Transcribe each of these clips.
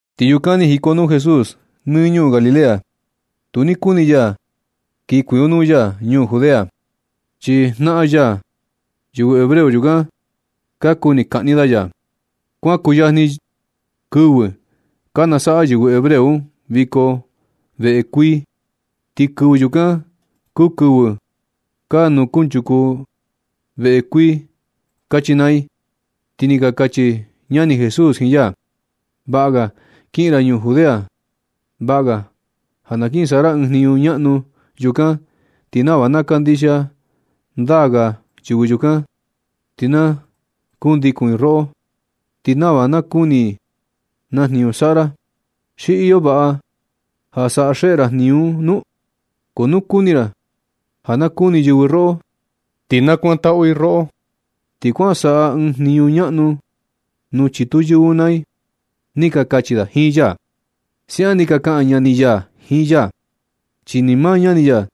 Ti yukan ni jikonuu Jesús nɨ ñuu Galilea. Tu ni kuni ya kin kuikonuu ya ñuu Judea, chi jnaꞌan ya, yɨvɨ hebreo yukan, ka kuni kaꞌni da ya. Kuan kuyajni kɨvɨ ka nasaꞌa yɨvɨ hebreo un viko veꞌe kuii, ti kɨvɨ yukan kuu kɨvɨ ka nukunchuku i veꞌe kuii kachi naa i. Ti ni ka kachi ñani Jesús jiin ya: ―Vaꞌa ga kiꞌin ra ñuu Judea. Vaꞌa ga ja na kin saꞌa ra ɨɨn jniñu ñaꞌnu yukan ti nava na kandixia ndaa ga yɨvɨ yukan ti na kundikun i roꞌo, ti nava na kuni i naa jniñu saꞌa ra. ¿Xi iyo vaꞌa ja saꞌa xeꞌe ra jniñu un nu? Ko nu kuni ra ja na kuni yɨvɨ roꞌo ti na kuantaꞌu i roꞌo, ti kuan saꞌa ɨɨn jniñu ñaꞌnu nuu chitu yɨvɨ un naa i ―ni ka kachi da jiin ya. Siaꞌan ni ka kaꞌan ñani ya jiin ya, chi ni maa ñani ya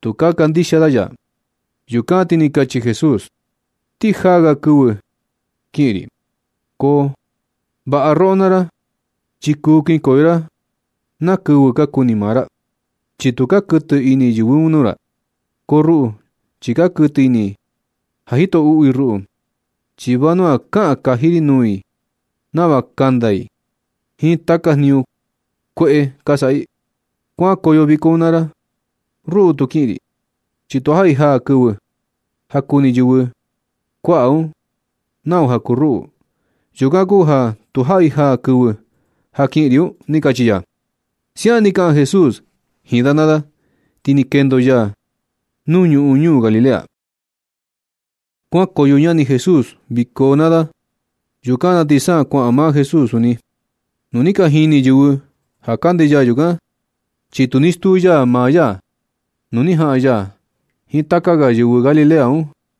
tu ka kandixia da ya. Yukan ti ni kachi Jesús: ―Ti jaa ga kɨvɨ kiꞌin ri. Ko vaꞌa roꞌo naa ra, chi kuu kinkoyo ra na kɨvɨ ka kuni maa ra, chi tu ka kuɨtɨ ini yɨvɨ un nuu ra. Ko ruꞌu, chi ka kuɨtɨ ini i ka jito uꞌu i ruꞌu, chi vanua kaꞌan kaji ri nuu i nava kanda i jiin taka jniñu kueꞌe ka saꞌa i. Kuankoyo viko un naa ra. Ruꞌu tu kiꞌin ri, chi tujaꞌi jaa kɨvɨ ja kuni yɨvɨ kuaꞌa un nau ja kuu ruꞌu. Yukan kuu ja tujaꞌi jaa kɨvɨ ja kiꞌin ri un ―ni kachi ya. Siaꞌan ni kaꞌan Jesús jiin da naa da, ti ni kendo ya nuu ñuꞌun ñuu Galilea. Kuankoyo ñani Jesús viko un naa da. Yukan na ti sa kuaꞌan maa Jesús suni. Tu ni ka jini yɨvɨ ja kande ya yukan, chi tu ni stuu ya maa ya. Tu ni jaꞌan ya jiin taka ga yɨvɨ Galilea un.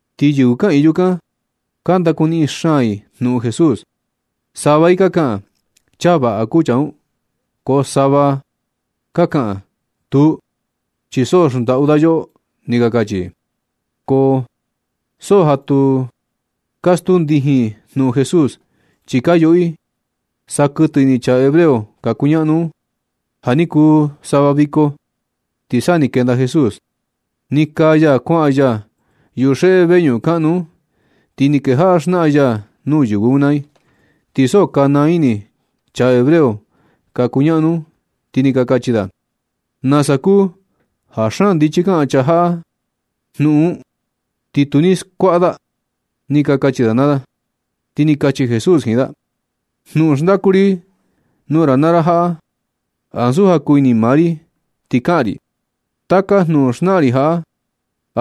Ti yɨvɨ kaꞌiin yukan ka ndakuniꞌin xaan i jnuꞌun Jesús. Sava i ka kaꞌan: “Chaa vaꞌa kuu chaa un.” Ko sava ga i ka kaꞌan: “Tuu, chi so xndaꞌu da yoꞌo”, ni ka kachi i. Ko so ja tu ka stuu ndijin i jnuꞌun Jesús, chi ka yuꞌu i sa kuɨtɨ ini chaa hebreo ka kuñaꞌnu un. Ja ni kuu sava viko, ti sa ni kenda Jesús, ni kaa ya kuaꞌa ya yuxeꞌe veñuꞌun kaꞌnu un, ti ni kejaꞌa xnaꞌan ya nuu yɨvɨ un naa i. Ti so ka naa ini chaa hebreo ka kuñaꞌnu un, ti ni ka kachi da: ―¿Nasa kuu ja xaan ndichi kaꞌan chaa jaꞌa jnuꞌun un, ti tu ni skuaꞌa da? ―ni ka kachi da naa da. Ti ni kachi Jesús jiin da: ―Jnuꞌun xndaku ri nuu ra naa ra jaꞌa, ansu ja kuu ini maa ri ti kaꞌan ri. Taka jnuꞌun xnaꞌan ri jaꞌa,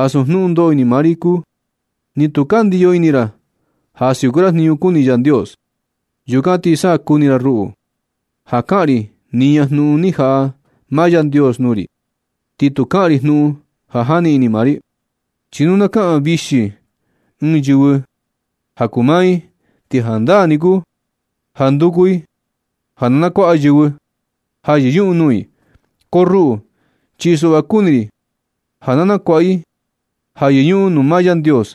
ansu jnuꞌun ndoꞌo ini maa ri kuu. Ti nu ka ndiyo ini ra ja siuku ra jniñu kuni Yandios, yukan ti sa nakuni ra ruꞌu, ja kaꞌan ri niña jnuꞌun ni jaꞌa maa Yandios nuu ri, ti tu kaꞌan ri jnuꞌun ja jani ini maa ri. Chi nu na kaꞌan vixi ɨɨn yɨvɨ ja kuu maa i, ti jandaa ni kuu ja nduku i ja na nakuaꞌa yɨvɨ ja yɨñuꞌun nuu i. Ko ruꞌu, chi suꞌva kuni ri ja na nakuaꞌa i ja yɨñuꞌun nuu maa Yandios,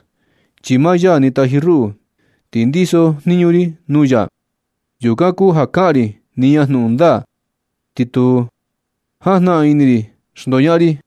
chi maa ya ni taji ruꞌu ti ndiso jniñu ri nuu ya. Yukan kuu ja kaꞌan ri niña jnuꞌun ndaa, ti tu jajnaꞌan ini ri xndoñaꞌan ri.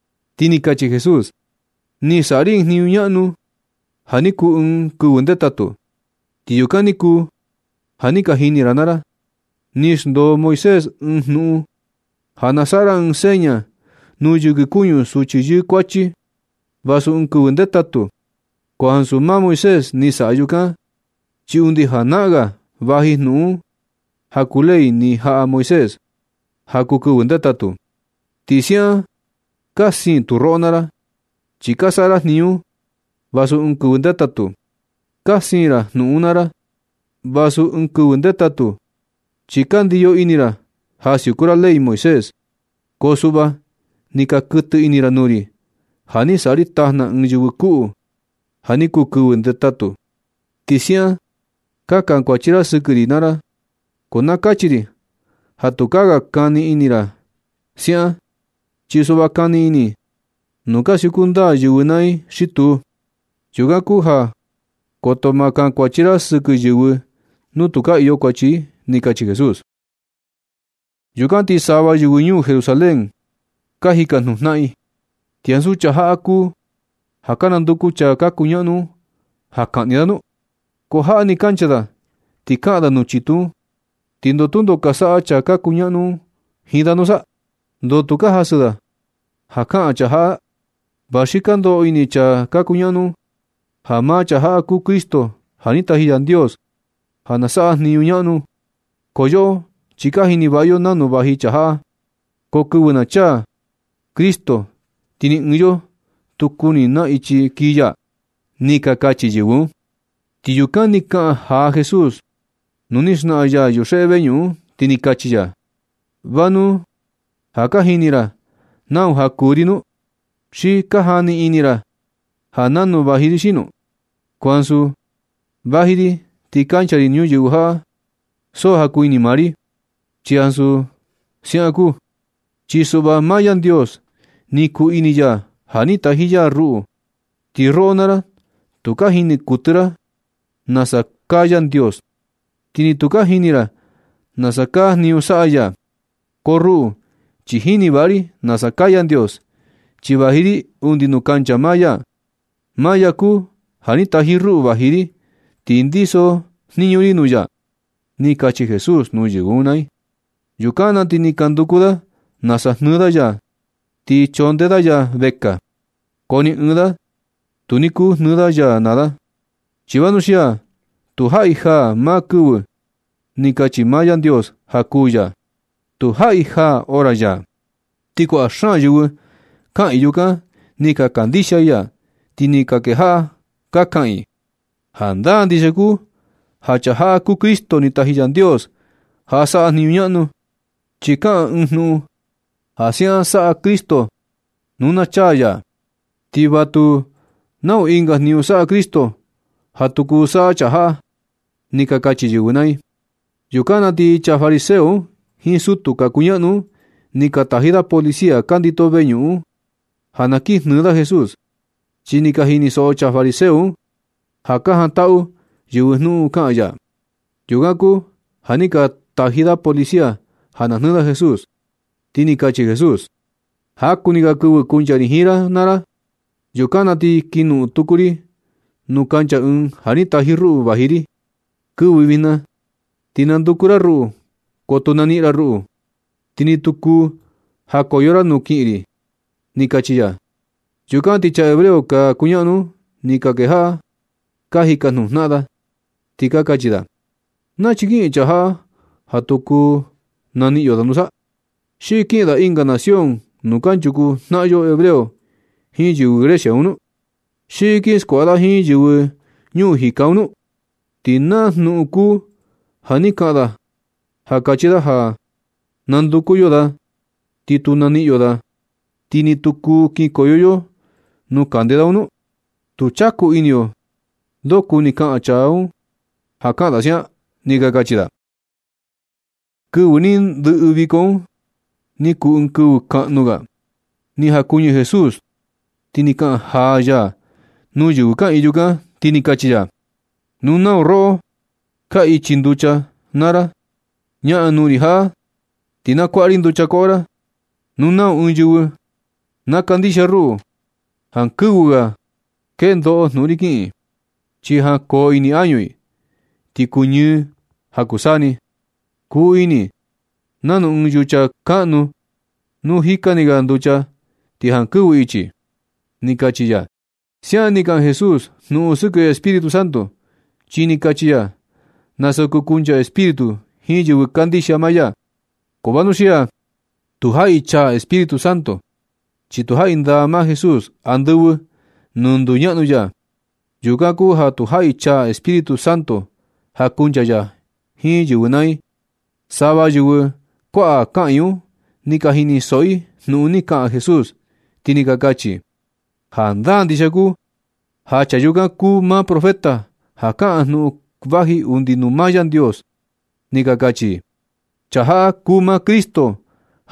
Ti ni kachi Jesús: ―Ni saꞌa ri ɨɨn jniñu ñaꞌnu ja ni kuu ɨɨn kɨvɨ ndetatu, ti yukan ni kuu ja ni ka jini ra naa ra. Ni xndoo Moisés ɨɨn jnuꞌun ja na saꞌa ra ɨɨn seña nuu yɨkɨ kuñu suchi yɨɨ kuachi vasu ɨɨn kɨvɨ ndetatu. Ko ansu maa Moisés ni saꞌa yukan, chi undi janaꞌan ga vaji jnuꞌun un ja kuu ley ni jaꞌa Moisés ja kuu kɨvɨ ndetatu. Ti siaꞌan ka siin tu roꞌo naa ra, chi ka saꞌa ra jniñu un vasu ɨɨn kɨvɨ ndetatu. Ka siin ra jnuꞌun un naa ra, vasu ɨɨn kɨvɨ ndetatu, chi ka ndiyo ini ra ja siuku ra Ley Moisés. Ko suꞌva ni ka kuɨtɨ ini ra nuu ri ja ni saꞌa ri tajna ɨɨn yɨvɨ kuꞌu ja ni kuu kɨvɨ ndetatu un. Ti siaꞌan ka kankuachi ra sɨkɨ ri naa ra. Ko na kachi ri ja tukaa ga kani ini ra siaꞌan, chi suꞌva kani ini nu ka siuku ndaa yɨvɨ naa i xi tu. Yukan kuu ja koto ma kankuachi ra sɨkɨ yɨvɨ nu tu ka iyo kuachi i ―ni kachi Jesús. Yukan na ti sava yɨvɨ ñuu Jerusalén un, ka jikajnuꞌun jnaꞌan i: ―¿Ti ansu chaa jaꞌa kuu ja ka nanduku chaa ka kuñaꞌnu un ja kaꞌni da nu? Ko jaꞌa ni kancha da ti kaꞌan da nuu chitu un, ¿ti ndoo tundo ka saꞌa chaa ka kuñaꞌnu un jiin da nusa? ¿Ndoo tu ka jasɨ da ja kaꞌan chaa jaꞌa? Va xi ka ndoꞌo ini chaa ka kuñaꞌnu un ja maa chaa jaꞌa kuu Cristo ja ni taji Yandios, ja na saꞌa jniñu ñaꞌnu. Ko yoꞌo chi ka jini vaꞌa yo nanu vaji chaa jaꞌa. Ko kɨvɨ na chaa Cristo ti ni ɨɨn yo tu kuni na ichi kii ya ―ni ka kachi yɨvɨ un. Ti yukan ni kaꞌan jaa Jesús nuu ni xnaꞌan ya yuxeꞌe veñuꞌun un, ti ni kachi ya: ―¿Va nu ja ka jini ra nau ja kuu ri nu? ¿Xi ka jani ini ra ja nanu vaji ri xino? Ko ansu vaji ri ti kancha ri ñuyɨvɨ jaꞌa ja so ja kuu ini maa ri. Ti ansu siaꞌan kuu. Chi suꞌva maa Yandios, ni kuu ini ya ja ni taji ya ruꞌu. Ti roꞌo naa ra tu ka jini kuɨtɨ ra nasa kaa Yandios, ti ni tu ka jini ra nasa kaa jniñu saꞌa ya. Ko ruꞌu, chi jini vaꞌa ri nasa kaa Yandios, chi vaji ri undi nuu kancha maa ya. Maa ya kuu ja ni taji ruꞌu vaji ri, ti ndiso jniñu ri nuu ya ―ni kachi Jesús nuu yɨvɨ un naa i. Yukan na ti ni ka nduku da nasa jnɨɨ da ya ti chondee da ya vekaa. Ko ni ɨɨn da tu ni kuu jnɨɨ da ya naa da, chi vanuxia tujaꞌi jaa maa kɨvɨ ni kachi maa Yandios ja kuu ya. Tujaꞌi jaa hora ya. Ti kuaꞌa xaan yɨvɨ kaꞌiin yukan ni ka kandixia i ya, ti ni ka kejaꞌa ka kaꞌan i: ―Jandaa ndixia kuu ja chaa jaꞌa kuu Cristo ni taji Yandios ja saꞌa jniñu ñaꞌnu, chi kaꞌan ɨɨn jnuꞌun ja siaꞌan saꞌa Cristo nu na chaa ya. Ti va tu nau ɨnga jniñu saꞌa Cristo ja tu kuu saꞌa chaa jaꞌa ―ni ka kachi yɨvɨ naa i. Yukan na ti chaa fariseo un jiin sutu ka kuñaꞌnu un, ni ka taji da policía ka ndito veñuꞌun un, ja na kin jnɨɨ da Jesús. Chi ni ka jinisoꞌo chaa fariseo un ja ka jantaꞌu yɨvɨ jnuꞌun kaꞌan ya. Yukan kuu ja ni ka taji da policía ja na jnɨɨ da Jesús. Ti ni kachi Jesús: ―Jaku ni ga kɨvɨ kuncha ri jiin ra naa ra. Yukan na ti kinoꞌon tuku ri nuu kancha ɨɨn ja ni taji ruꞌu vaji ri. Kɨvɨ jña ti nanduku ra ruꞌu, ko tu naniꞌin ra ruꞌu. Ti ni tu kuu jakoyo ra nuu kiꞌin ri ―ni kachi ya. Yukan ti chaa hebreo ka kuñaꞌnu un, ni ka kejaꞌa ka jikajnuꞌun jnaꞌan da, ti ka kachi da: ―¿Nachi kiꞌin chaa jaꞌa ja tu kuu naniꞌin yo da nusa? ¿Xi kiꞌin da ɨnga nación nuu kanchuku jnaꞌan yo hebreo jiin yɨvɨ Grecia un nu? ¿Xi kin skuaꞌa da jiin yɨvɨ ñuu jika un nu? ¿Ti na jnuꞌun kuu ja ni kaꞌan da ja kachi da ja nanduku yo da ti tu naniꞌin yo da, ti ni tu kuu kinkoyo yo nuu kande da un nu? Tu chaku ini yo ndo kuni kaꞌan chaa un ja kaꞌan da siaꞌan ―ni ka kachi da. Kɨvɨ ni ndɨꞌɨ viko un ni kuu ɨɨn kɨvɨ kaꞌnu ga, ni jakuɨñɨ Jesús ti ni kaꞌan jaa ya nuu yɨvɨ kaꞌiin yukan, ti ni kachi ya: ―Nu nau roꞌo ka ichi nducha naa ra, ñaꞌan nuu ri jaꞌa ti na kuaꞌa ri nducha koꞌo ra. Nu nau ɨɨn yɨvɨ na kandixia ruꞌu, jankɨvɨ ga kendoꞌo jnuꞌun ri kiꞌin, chi jankoo ini añu i, ti kuñɨɨ ja kuu saa ni. Kuu ini i nanu ɨɨn yucha kaꞌnu nu jika ni ga nducha ti jankɨvɨ ichi ―ni kachi ya. Siaꞌan ni kaꞌan Jesús jnuꞌun sɨkɨ Espíritu Santo, chi ni kachi ya nasa kuu kuncha Espíritu jiin yɨvɨ kandixia maa ya. Ko vanuxia tujaꞌi chaa Espíritu Santo, chi tujaꞌi ndaa maa Jesús andɨvɨ nuu nduñaꞌnu ya. Yukan kuu ja tujaꞌi chaa Espíritu Santo ja kuncha ya jiin yɨvɨ naa i. Sava yɨvɨ kuaꞌa kaꞌiin un ni ka jinisoꞌo i jnuꞌun, ni kaꞌan Jesús, ti ni ka kachi i: ―Jandaa ndixia kuu ja chaa yukan kuu maa Profeta ja kaꞌan jnuꞌun vaji undi nuu maa Yandios ―ni ka kachi i. ―Chaa jaꞌa kuu maa Cristo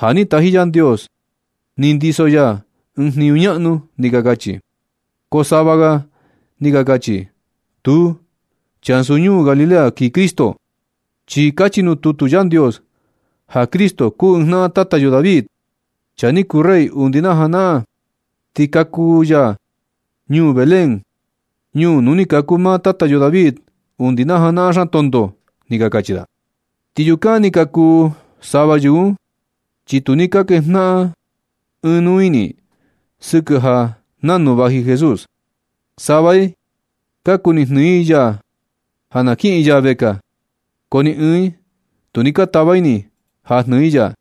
ja ni taji Yandios, chi ndiso ya ɨɨn jniñu ñaꞌnu ―ni ka kachi i. Ko sava ga i ni ka kachi: ―Tuu, chi ansu ñuu Galilea kii Cristo. Chi kachi nuu tutu Yandios ja Cristo kuu ɨɨn jnaꞌan tata yo David, chaa ni kuu rey undi na janaꞌan. Ti kaku ya ñuu Belén, ñuu nuu ni kaku maa tata yo David undi na janaꞌan xaan tonto ―ni ka kachi i. Ti yukan ni ka kuu sava yɨvɨ un, chi tu ni kejnaꞌan ɨɨn nuu ini i sɨkɨ ja nanu vaji Jesús. Sava i ka kuni jnɨɨ i ya ja na kiꞌin ya vekaa, ko ni ɨɨn i tu ni ka tava ini ja jnɨɨ i ya.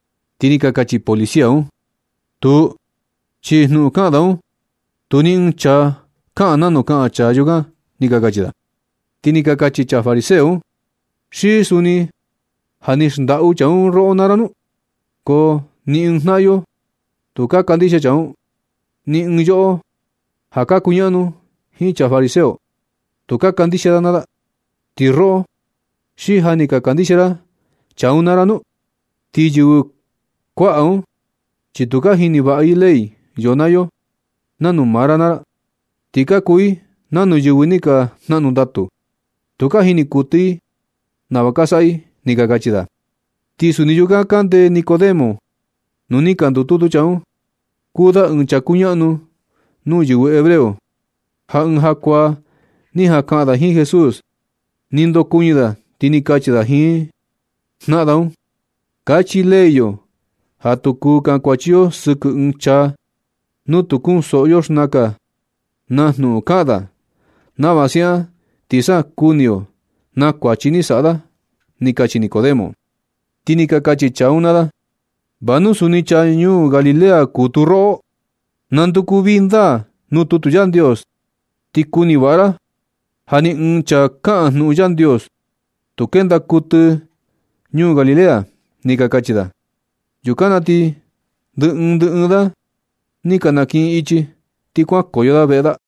Ti ni ka kachi policía un: ―Tuu, chi jnuꞌun kaꞌan da un, tu ni ɨɨn chaa kaꞌan nanu kaꞌan chaa yukan ―ni ka kachi da. Ti ni ka kachi chaa fariseo un: ―¿Xi suni ja ni xndaꞌu chaa un roꞌo naa ra nu? Ko ni ɨɨn jnaꞌan yo tu ka kandixia chaa un. Ni ɨɨn yoꞌo ja ka kuñaꞌnu jiin chaa fariseo, tu ka kandixia da naa da. ¿Ti roꞌo, xi ja ni ka kandixia ra chaa un naa ra nu? Ti yɨvɨ kuaꞌa un chi tu ka jini vaꞌa i ley yo naa yo nanu maa ra naa ra, ti ka kuu i nanu yɨvɨ ni ka jnaꞌnu ndatu. Tu ka jini kuɨtɨ i nava ka saꞌa i ―ni ka kachi da. Ti suni yukan kande Nicodemo nuu ni ka ndututu chaa un. Kuu da ɨɨn chaa kuñaꞌnu nuu yɨvɨ hebreo, ja ɨɨn jakuaa ni jaꞌan kaꞌan da jiin Jesús. Ni ndokuɨñɨ da ti ni kachi da jiin naꞌan da un: ―Kachi Ley yo ja tu kuu kankuachi yo sɨkɨ ɨɨn chaa, nu tu kunsoꞌo yo xnaka na jnuꞌun kaꞌan da, nava siaꞌan ti sa kuni yo na kuachi ni saꞌa da ―ni kachi Nicodemo. Ti ni ka kachi chaa un naa da: ―¿Va nu suni chaa ñuu Galilea kuu tu roꞌo? Nanduku vii ndaa nuu tutu Yandios, ti kuni vaꞌa ra ja ni ɨɨn chaa kaꞌan jnuꞌun Yandios, tu kenda kuɨtɨ ñuu Galilea ―ni ka kachi da. Yukan na ti ndɨ ɨɨn ndɨ ɨɨn da ni ka nakiꞌin ichi, ti kuan nukoyo da veꞌe da.